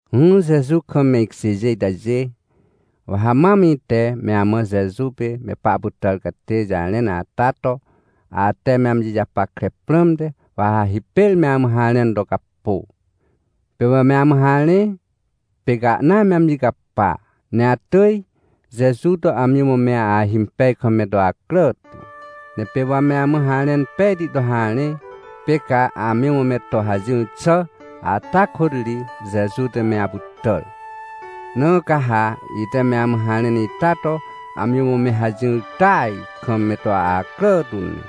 Ỹhỹ Jeju kam me ikjêjê itajê, wa ha mam ite me amã Jeju pê me pahpytàr catê jarẽn ata to, ate me amji japackre prãmte, wa ha hipêr me amã harẽn to capô. Pê wa me amã harẽ, pê ca ahna me amji capa, ne atỳj Jeju to amji mã me ahimpej kam me to acrà tu. Ne pê wa me amã harẽn pejti to harẽ, pê ca amji mã me to hajỹr xà ata kôt ri, Jeju te me apytàr. Na ca ha ite me amã harẽn ita to amji mã me hajỹr tỳaj kam me to acrà tu ne.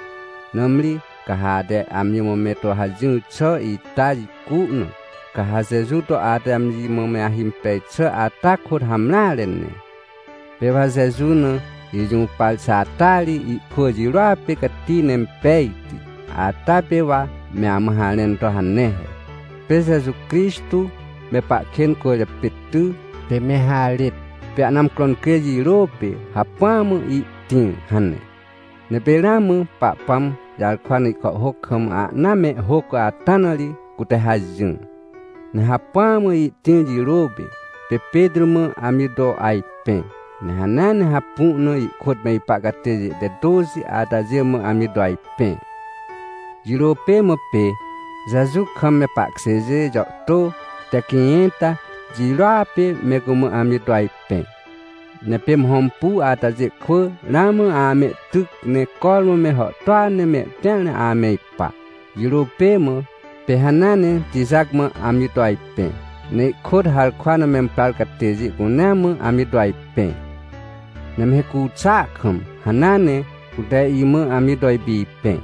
Nãmri ca ha ate amji mã me to hajỹr xà ita jicu na, ca ha Jeju to ate amji mã me ahimpej xà ata kôt hamreare ne. Pê wa Jeju na ijũpar xà ata ri ihkwỳ jirôa pê cati ne impejti, ata pê wa me amã harẽn to hane he: “Pê Jeju Crixtô me pahkên cwỳrjapê ty, pê me harêt, pê ahna amcro incrê jirô pê, hacpỹa mã ihtĩr” hane. Ne pê ramã Pahpãm jarkwa na ihkàhhôc kam ahna mehhôc ata na ri cute hajỹr. Ne hacpỹa mã ihtĩr jirô pê, pê Petrô mã amji to ajpẽ. Ne hanea ne hapu na, ihkôt me ipa catêjê te tôxi atajê mã amji to ajpẽ. Jirô pê mã pê, Jeju kam me pahkjêjê jàhtô te quĩjẽnta jirôa pê me cumã amji to ajpẽ. Ne pê me hõmpu atajê kwỳ ramã amehtyc, ne cormã me hàhtôa ne mehtĩar na ame ipa. Jirô pê mã, pê hanea ne Tijac mã amji to ajpẽ, ne ihkôt harkwa na memprar catêjê cunea mã amji to ajpẽ. Ne me hicu xàa kam hanea ne cute imã amji to ipipẽ,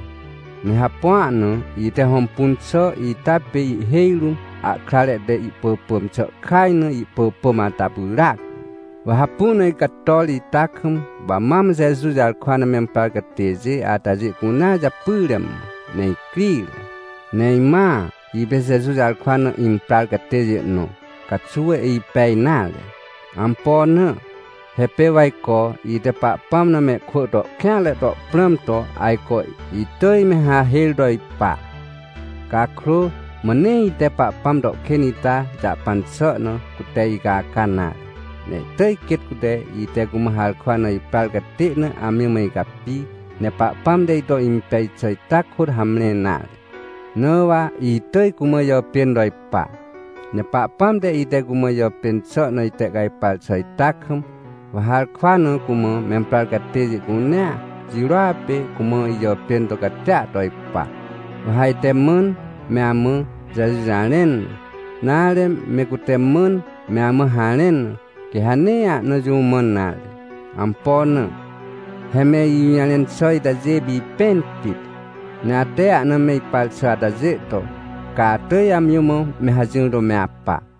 ne hapua na ite hõmpun xà ita pê ihhêj rũm, ahkrare te ihpỳpỳm xà kaj na ihpỳpỳm ata pyràac. Wa hapu na icator ita kam, wa mam Jeju jarkwa na memprar catêjê atajê cunea japyre mã, ne icrire. Ne imãa ipê Jeju jarkwa na imprar catêjê nõ caxuw ipej nare. Ampo na? He pê wa ajco ite Pahpãm na mehkwỳ to kêanre to prãm to, ajco itỳj me hahêr to ipa. Cakrô mã nee ite Pahpãm to kên ita jahpan xà na, cute icaca nare, ne ihtỳj quêt cute, ite cumã harkwa na iprar catê na amji mã icapi, ne Pahpãm te ito impej xà ita kôt hamre nare, na wa itỳj cumã ijàpên to ipa. Ne Pahpãm te, ite cumã ijàpên xà na itehcajpar xà ita kam, wa harkwa na cumã memprar catêjê cunea jirôa pê cumã ijàpên to catia to ipa. Wa ha ite mãn me amã Jeju jarẽn na, nare, me cute mãn me amã harẽn na, quê ha nee ahna jũ mãn nare. Ampo na? He me ijũjarẽn xà itajê pipẽn pit. Ne ate ahna me ipar xà atajê to, ca atỳj amji mã me hajỹr to me apa.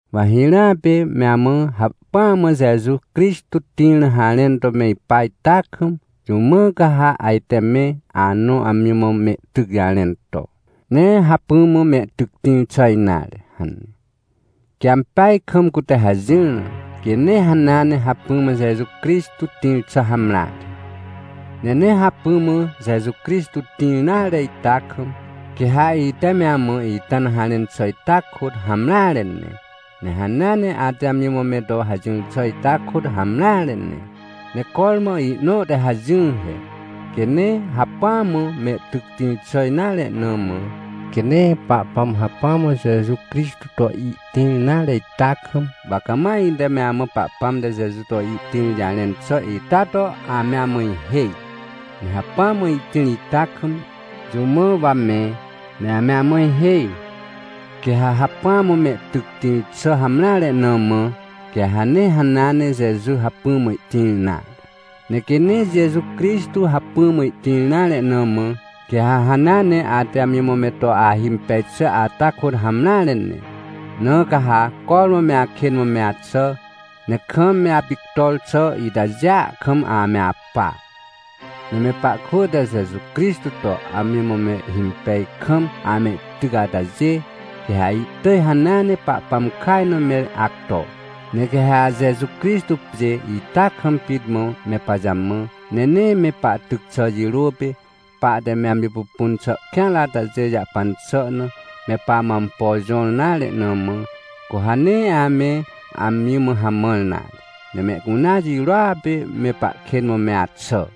Wa hirãa pê me amã hacpỹa mã Jeju Crixtô tĩr na harẽn to me ipa ita kam, jũ mã ca ha ajte me anõ amji mã mehtyc jarẽn to: — Nee hacpỹ mã mehtyc tĩr xà nare — hane. Quê ampeaj kam cute hajỹr na, quê nee hanea ne hacpỹ mã Jeju Crixtô tĩr xà hamreare. Ne nee hacpỹa mã Jeju Crixtô tĩr nare ita kam, quê ha ite me amã ita na harẽn xà ita kôt hamreare ne, ne hanea ne ate amji mã me to hajỹr xà ita kôt hamreare ne. Ne cormã ihnõ te hajỹar he. Quê nee hacpỹa mã mehtyc tĩr xà nare na mã, quê nee Pahpãm hacpỹa mã Jeju Crixtô to ihtĩr nare ita kam, wa cama ite me amã Pahpãm te Jeju to ihtĩr jarẽn xà ita to ame amã ihêj. Ne hacpỹa mã ihtĩr ita kam, jũ mã wa me, ne ame amã ihêj? Quê ha hacpỹa mã mehtyc tĩr xà hamreare na mã, quê ha nee hanea ne Jeju hacpỹ mã ihtĩr nare. Ne quê nee Jeju Crixtô hacpỹa mã ihtĩr nare na mã, quê ha hanea ne ate amji mã me to ahimpej xà ata kôt hamreare ne, na ca ha cormã me akên mã me axà, ne kam me apictor xà itajêa kam ame apa. Ne me pahkwỳ te Jeju Crixtô to amji mã mehhimpeaj kam amehtyc atajê, quê ha ihtỳj hanea ne Pahpãm kaj na me acto. Ne quê ha Jeju Crixtô pjê ita kam pit mã me pajamã, ne nee me pahtyc xà jirô pê, pahte me amji pupun xà kêanre atajê jahpan xà na, me pamã ampo jõr nare na mã, cu ha nee ame amji mã hamãr nare, ne mehcunea jirôa pê me pahkên mã me axà.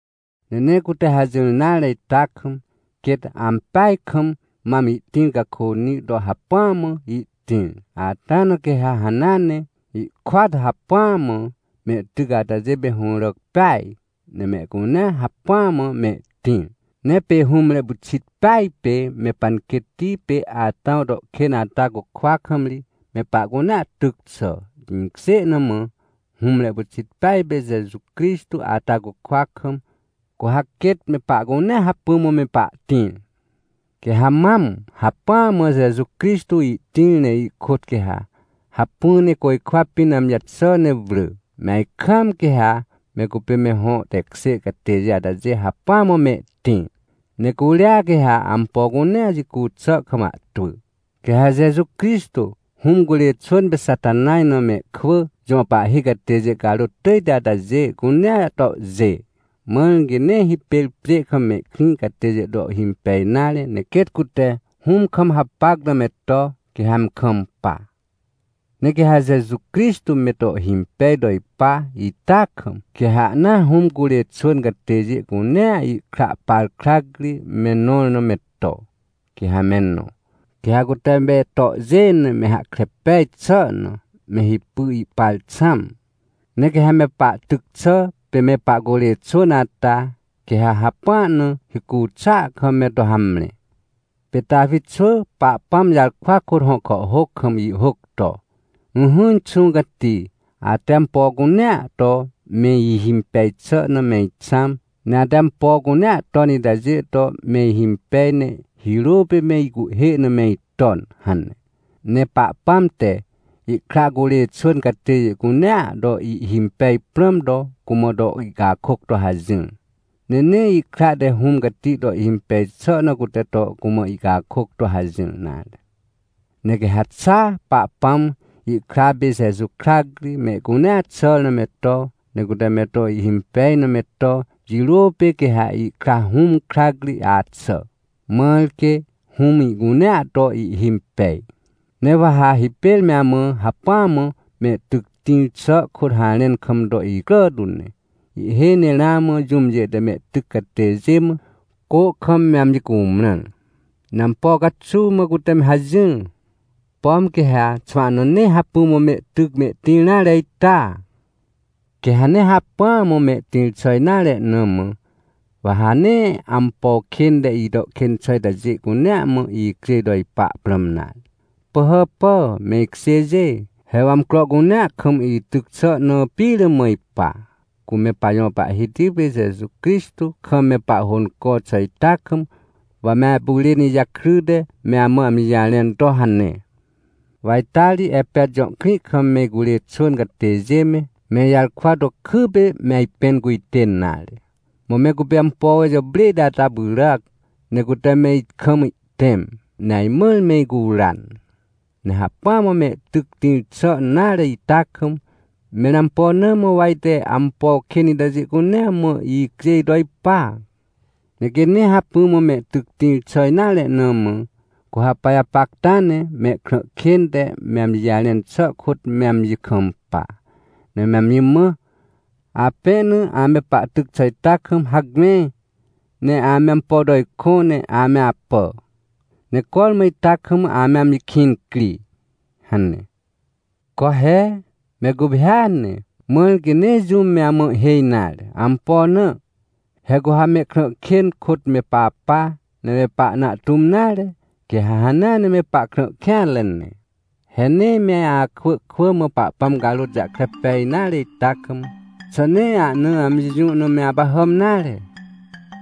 Ne nee cute hajỹr nare ita kam, quêt ampeaj kam mam ihtĩr cakônĩ to hacpỹa mã ihtĩr, ata na quê ha hanea ne, ihkôat hacpỹa mã mehtyc atajê pê hũràc peaj, ne mehcunea hacpỹa mã mehtĩr. Ne pê hũmre pyxit peaj pê me panquêtti pê Atãw to kên ata cukwa kam ri, me pahcunea tyc xà. Jĩkjê na mã, hũmre pyxit peaj pê Jeju Crixtô ata cukwa kam, cu ha quêt me pahcunea hacpỹ mã me pahtĩr. Quê ha mam hacpỹa mã Jeju Crixtô ihtĩr, ne ihkôt quê ha hacpỹ ne côjkwa pĩn amji jaxà ne wrỳ, me ajkaam, quê ha me cupê me hõ tekjê catêjê atajê hacpỹa mã mehtĩr. Ne curia quê ha ampo cunea jicu xà kam ahtwỳ. Quê ha Jeju Crixtô, Hũm curê xwỳn pê Xatanaj na mehkwỳ jõ pahhi catêjê carôt tỳjti atajê, cunea tohjê. Mãr quê nee hipêr pjê kam mehkrĩ catêjê to ihhimpej nare, ne quêt cute Hũm kam hapac na me to, quê ha me kampa. Ne quê ha Jeju Crixtô me to ihhimpej to ipa ita kam, quê ha ahnaa Hũm curê xwỳn catêjê cunea ihkra par krac ri me nõr na me to, quê ha me nõ. Quê ha cute me tohjê na me hahkre pej xà na, me hipy ihpar xãm. Ne quê ha me pahtyc xà pê me pahcurê xwỳn ata, quê ha hapua na hicu xàa kam me to hamre. Pê Tawi xwỳ Pahpãm jarkwa kôt hõ kàhhôc kam ihhôc to: “Ỹhỹ, Inxũ Cati, ate ampo cunea to me ihimpej xà na me ixãm, ne ate ampo cunea ton itajê to me ihimpej, ne hirô pê me icuhhê na me iton” hane. Ne Pahpãm te ihkra curê xwỳn catêjê cunea to ihhimpej prãm to, cumã to ihcakôc to hajỹr. Ne nee ihkra te Hũm Cati to ihhimpej xà na cute to cumã ihcakôc to hajỹr nare. Ne quê ha xa Pahpãm, ihkra pê Jeju krac ri mehcunea xàr na me to, ne cute me to ihhimpej na me to, jirô pê quê ha ihkra Hũm krac ri axà, mãr quê Hũm ihcunea to ihhimpej. Ne wa ha hipêr me amã hacpỹa mã mehtyc tĩr xà kôt harẽn kam to icrà tu ne. Ihhêj ne ramã jũmjê te mehtyc catêjê mã, cô kam me amji cumrãr. Ne ampo caxuw mã cute me hajỹr? Pom quê ha xwahna nee hacpỹ mã mehtyc mehtĩr nare ita? Quê ha nee hacpỹa mã mehtĩr xà nare na mã, wa ha nee ampo kên te ito kên xà itajê cunea mã icjêj to ipa prãm nare. Pỳhàpà, me ikjêjê! He wa amcro cunea kam ityc xà na pire mã ipa, cu me pajõ Pahhiti pê Jeju Crixtô kam me pahhônco xà ita kam, wa me apyrên ijakryte, me amã amji jarẽn to hane. Wa ita ri Epet jõ krĩ kam me icurê xwỳn catêjê me, me ijarkwa to kypê me ajpẽn cujtên nare. Mã me cupê ampo jàprêhti ata pyràc, ne cute me ikam ihtẽm, ne ajmãr me icuran. Ne hacpỹa mã mehtyc tĩr xà nare ita kam, mẽr ampo na mã wa ajte ampo kên itajê cunea mã icjêj to ipa? Ne quê nee hacpỹ mã mehtyc tĩr xà nare na mã, cu ha pajapacta ne mehkrã kên te me amji jarẽn xà kôt me amji kampa, ne me amji mã: — Apẽ na ame pahtyc xà ita kam, hacme, ne ame ampo to ikõ, ne ame apà, ne cormã ita kam ame amji kĩn cri — hane. Co he! Me guphêa ne, mãr quê nee jũm me amã ihhêj nare! Ampo na? He cu ha mehkrã kên kôt me papa, ne me pahna ahtũm nare, quê ha hanea ne me pahkrã kêanre ne. He nee me akwỳ kwỳ mã Pahpãm carôt jahkre pej nare ita kam, xà nee ahna amji jũ na me apahàm nare?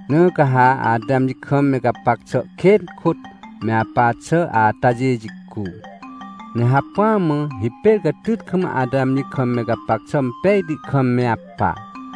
Na ca ha ate amji kam me gapac xà kên kôt me apa xà atajê jicu, ne hacpỹa mã hipêr catyt kam ate amji kam me gapac xà impejti kam me apa.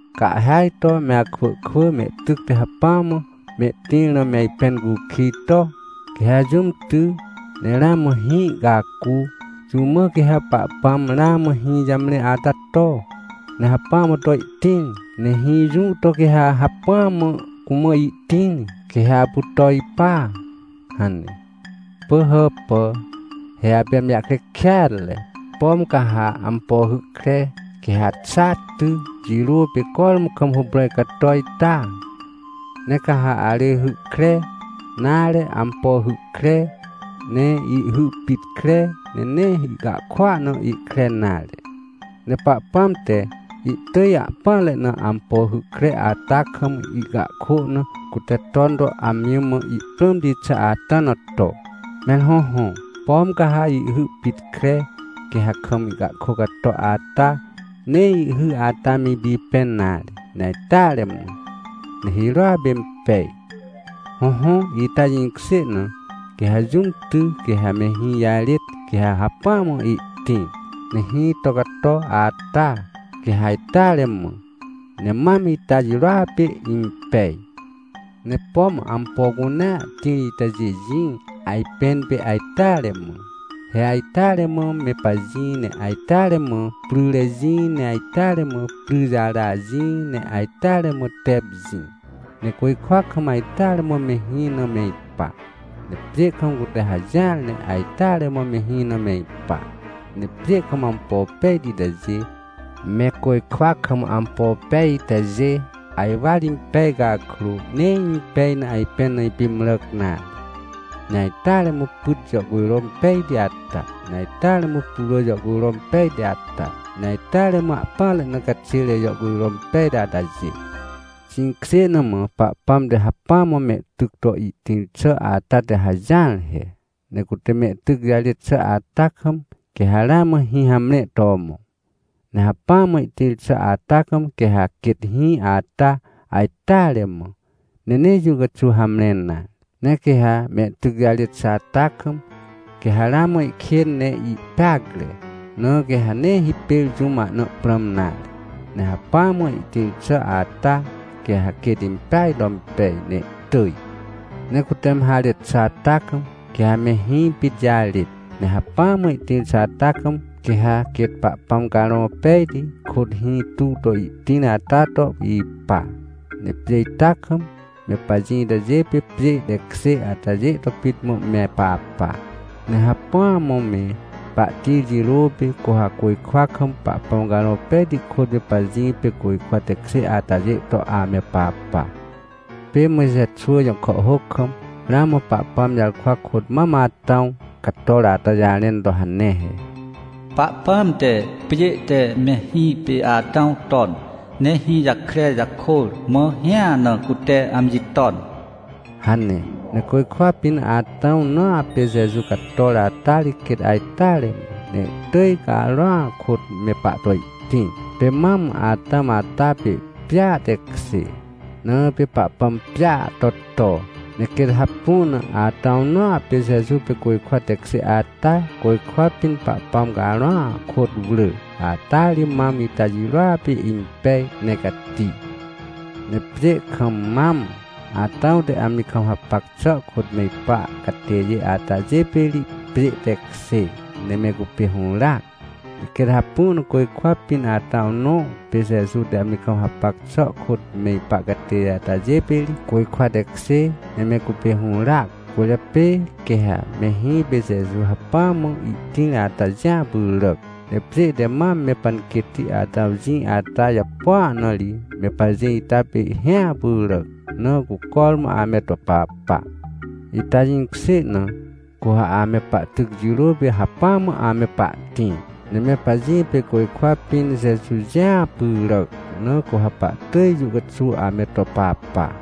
Ca ihhêaj to me akwỳ kwỳ mehtyc te hacpỹa mã mehtĩr na me ajpẽn cukij to: — Quê ha jũm ty, ne ramã hĩ ihcacu, jũ mã quê ha Pahpãm ramã hĩ jamre ata to, ne hacpỹa mã to ihtĩr? Ne hĩ jũ to quê ha hacpỹa mã cumã ihtĩr, quê ha apu to ipa? — hane. Pỳhàpà! He apê amji jahkre kêatre! Pom ca ha ampo hy kre, quê ha xa ty, jirô pê cormã kam huprãj cato ita? Ne ca ha arỳjhy kre, nare, ampo hy kre, ne ihhy pit kre, ne nee ihcahkôa na ihkre nare. Ne Pahpãm te, ihtỳj ahpỹanre na ampo hy kre ata kam ihcahkô na, cute ton to amji mã ihprãmti xà ata na to. Mẽr hõhõ, pom ca ha ihhy pit kre, quê ha kam ihcakô cato ata, nee ihhy ata me ipipẽn nare, ne ajteare mã, ne hirôa pê impej. Hõhõ, ita jĩkjê na, quê ha jũm ty, quê ha me hĩ jarêt, quê ha hacpỹa mã ihtĩr, ne hĩ to cato ata, quê ha ajteare mã, ne mam ita jirôa pê impej. Ne pom ampo cunea tĩr itajê jĩ, ajpẽn pê ajteare mã. He ajteare mã me pajĩ, ne ajteare mã pryre jĩ, ne ajteare mã pryjara jĩ, ne ajteare mã tep jĩ. Ne côjkwa kam, ajteare mã me hĩ na me ipa. Ne pjê kam cute hajỹar ne ajteare mã me hĩ na me ipa. Ne pjê kam ampo pejti itajê, me côjkwa kam ampo pej itajê, ajwar impej cakrô, nee impej na ajpẽn na ipimràc nare. Ne ajteare mã pyt jàhcujro impejti ata, ne ajteare mã putwrỳ jàhcujro impejti ata, ne ajteare mã ahpỹanre na caxêre jàhcujro impejti atajê. Jĩkjê na mã Pahpãm te hacpỹa mã mehtyc to ihtĩr xà ata te hajỹar he. Ne cute mehtyc jarêt xà ata kam, quê ha ramã hĩ hamre to mõ. Ne hacpỹa mã ihtĩr xà ata kam, quê ha quêt hĩ ata ajteare mã, ne nee jũ caxuw hamre nare. Ne quê ha mehtyc jarêt xà ata kam, quê ha ramã ihkên ne ihpeacre, na quê ha nee hipêr jũm ahna prãm nare. Ne hacpỹa mã ihtĩr xà ata, quê ha quêt impeaj to impej, ne ihtỳj. Ne cute me harêt xà ata kam, quê ha me hĩ pit jarêt. Ne hacpỹa mã ihtĩr xà ata kam, quê ha quêt Pahpãm Carõ Pejti kôt hĩ tuw to ihtĩr ata to ipa. Ne pjê ita kam, me pajĩ itajê pê pjê tekjê atajê to pit mã me papa. Ne hacpỹa mã me pahtĩr jirô pê, cu ha côjkwa kam, Pahpãm Carõ Pejti kôt me pajĩ pê côjkwa tekjê atajê to ame papa. Pê Mojxe xwỳ jõ kàhhôc kam, ramã Pahpãm jarkwa kôt mam Atãw cator ata jarẽn to hane he: “Pahpãm te pjê te mehĩ pê Atãw ton, ne hĩ jakre jakôr, mã hĩa na cute amji ton” hane. Ne côjkwa pĩn Atãw nõa pê Jeju cator ata ri quêt ajteare mã, ne ihtỳj Carõa kôt me pahto ihtĩr. Pê mam Atãw ata pê pjêa tekjê, na pê Pahpãm pjêa to, to. Ne quêt hapu na Atãw nõa pê Jeju pê côjkwa tekjê ata, côjkwa pĩn Pahpãm Carõa kôt wrỳ, ata ri mam ita jirôa pê impej, ne cati. Ne pjê kam mam Atãw te amji kam hapac xà kôt me ipa catêjê atajê pê ri, pjê tekjê, ne me cupê hũràac. Ne quêt hapu na côjkwa pĩn Atãw nõ pê Jeju te amji kam hapac xà kôt me ipa catêjê atajê pê ri, côjkwa tekjê, ne me cupê hũràac. Cwỳrjapê quê ha me hĩ pê Jeju hacpỹa mã ihtĩr ata jĩa pyràc. Ne pjê te mam me panquêtti Atãw jĩ ata japua na ri, me pajĩ ita pê hĩa pyràc, na cu cormã ame to papa. Ita jĩkjê na, cu ha ame pahtyc jirô pê hacpỹa mã ame pahtĩr, ne me pajĩ pê côjkwa pĩn Jeju jĩa pyràc, na cu ha pahtỳj jũ caxuw ame to papa.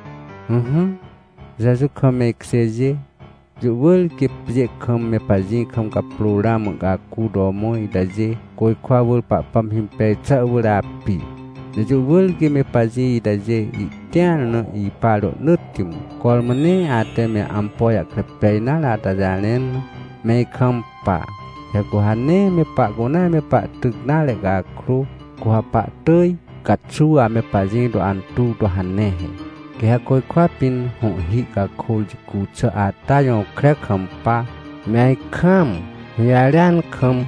Ỹhỹ, Jeju kam me ikjêjê, jũ wỳr quê pjê kam me pajĩ kam caprô ramã ihcacu to mõ itajê, côjkwa wỳr Pahpãm himpej xà wỳr api. Ne jũ wỳr quê me pajĩ itajê ihtĩar na ipa rohnỳtti mã. Cormã nee ate me ampo jahkre pej nare ata jarẽn na, me ikampa. He cu ha nee me pahcunea me pahtyc nare cakrô, cu ha pahtỳj caxuw ame pajĩ to antuw to hane he. Quê ha côjkwa pĩn hõhhi cakôr jicu xà ata jõkre kampa, me ajkaam, hũjarêan kam,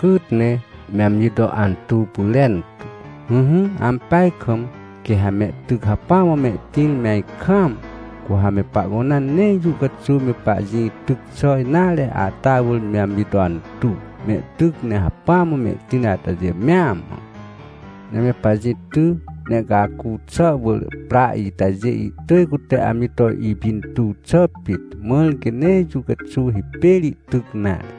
cyt ne, me amji to antuw pyrentu. Ỹhỹ, ampeaj kam, quê ha mehtyc hacpỹ mã mehtĩr me ajkaam, cu ha me pahcunea nee jũ caxuw me pajĩ tyc xà nare ata wỳr me amji to antuw, mehtyc ne hacpỹa mã mehtĩr atajê mea mã. Ne me pajĩ ty, ne ihcacu xà wỳr pra itajê, ihtỳj cute amji to ipintuw xà pit, mãr quê nee jũ caxuw hipêr ihtyc nare.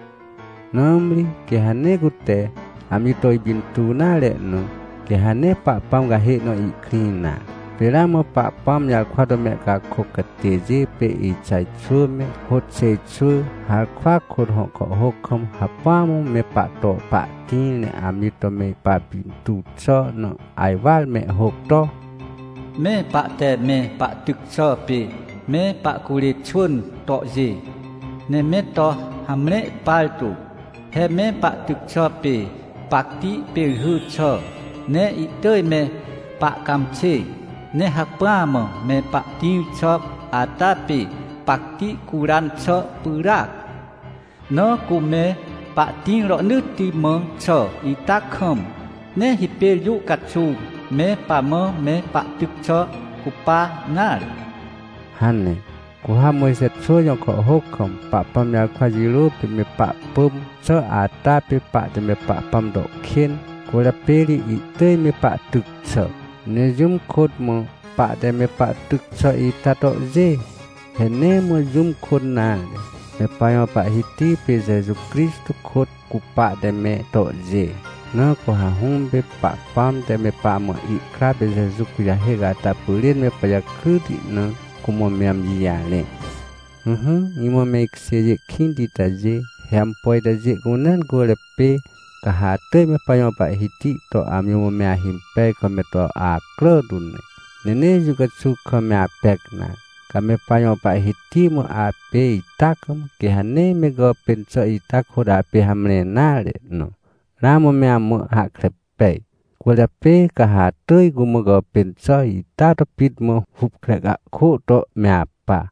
Nãmri quê ha nee cute amji to ipintuw nare na, quê ha nee Pahpãm cahê na ihkrĩ nare. Pê ramã Pahpãm jarkwa to mehcakôc catêjê pê Ixaj xwỳ me, Hôxêj xwỳ, harkwa kôt hõ kàhhôc kam hacpỹa mã me pahto pahtĩr, ne amji to me papintuw xà na ajwar mehhôc to: “Me pahte me pahtyc xà pê me pahcurê xwỳn tohjê, ne me to hamre partu. He me pahtyc xà pê pacti pêrhy xà, ne ihtỳj me pahcãmxê. Ne hacpỹa mã me pahtĩr xà ata pê pacti curan xà pyràac. Na cu me pahtĩr rohnỳtti mã xà ita kam, nee hipêr jũ caxuw me pamã me pahtyc xà cupa nare” hane. Cu ha Mojxe xwỳ jõ kàhhôc kam Pahpãm jarkwa jirô pê me pahpỳm xà ata pê pahte me Pahpãm to kên, cwỳrjapê ri ihtỳj me pahtyc xà. Ne jũm kôt mã pahte me pahtyc xà ita tohjê? He nee mã jũm kôt nare, me pajõ Pahhiti pê Jeju Crixtô kôt, cu pahte me tohjê. Na cu ha Hũm pê Pahpãm te me pamã ihkra pê Jeju kujahêc ata pyrên me pajakryti na cumã me amji jarẽ. Ỹhỹ, imã me ikjêjê kĩnti itajê, he ampo itajê cunea cwỳrjapê, ca ha atỳj me pajõ Pahhiti to amji mã me ahimpej kam me to acrà tu ne, ne nee jũ caxuw kam me apec nare. Ca me pajõ Pahhiti mã apê ita kam, quê ha nee me gàpên xà ita kôt apê hamre nare na, ramã me amã hahkre pej. Cwỳrjapê ca ha atỳj cumã gàpên xà ita to pit mã hupkre cahkô to me apa.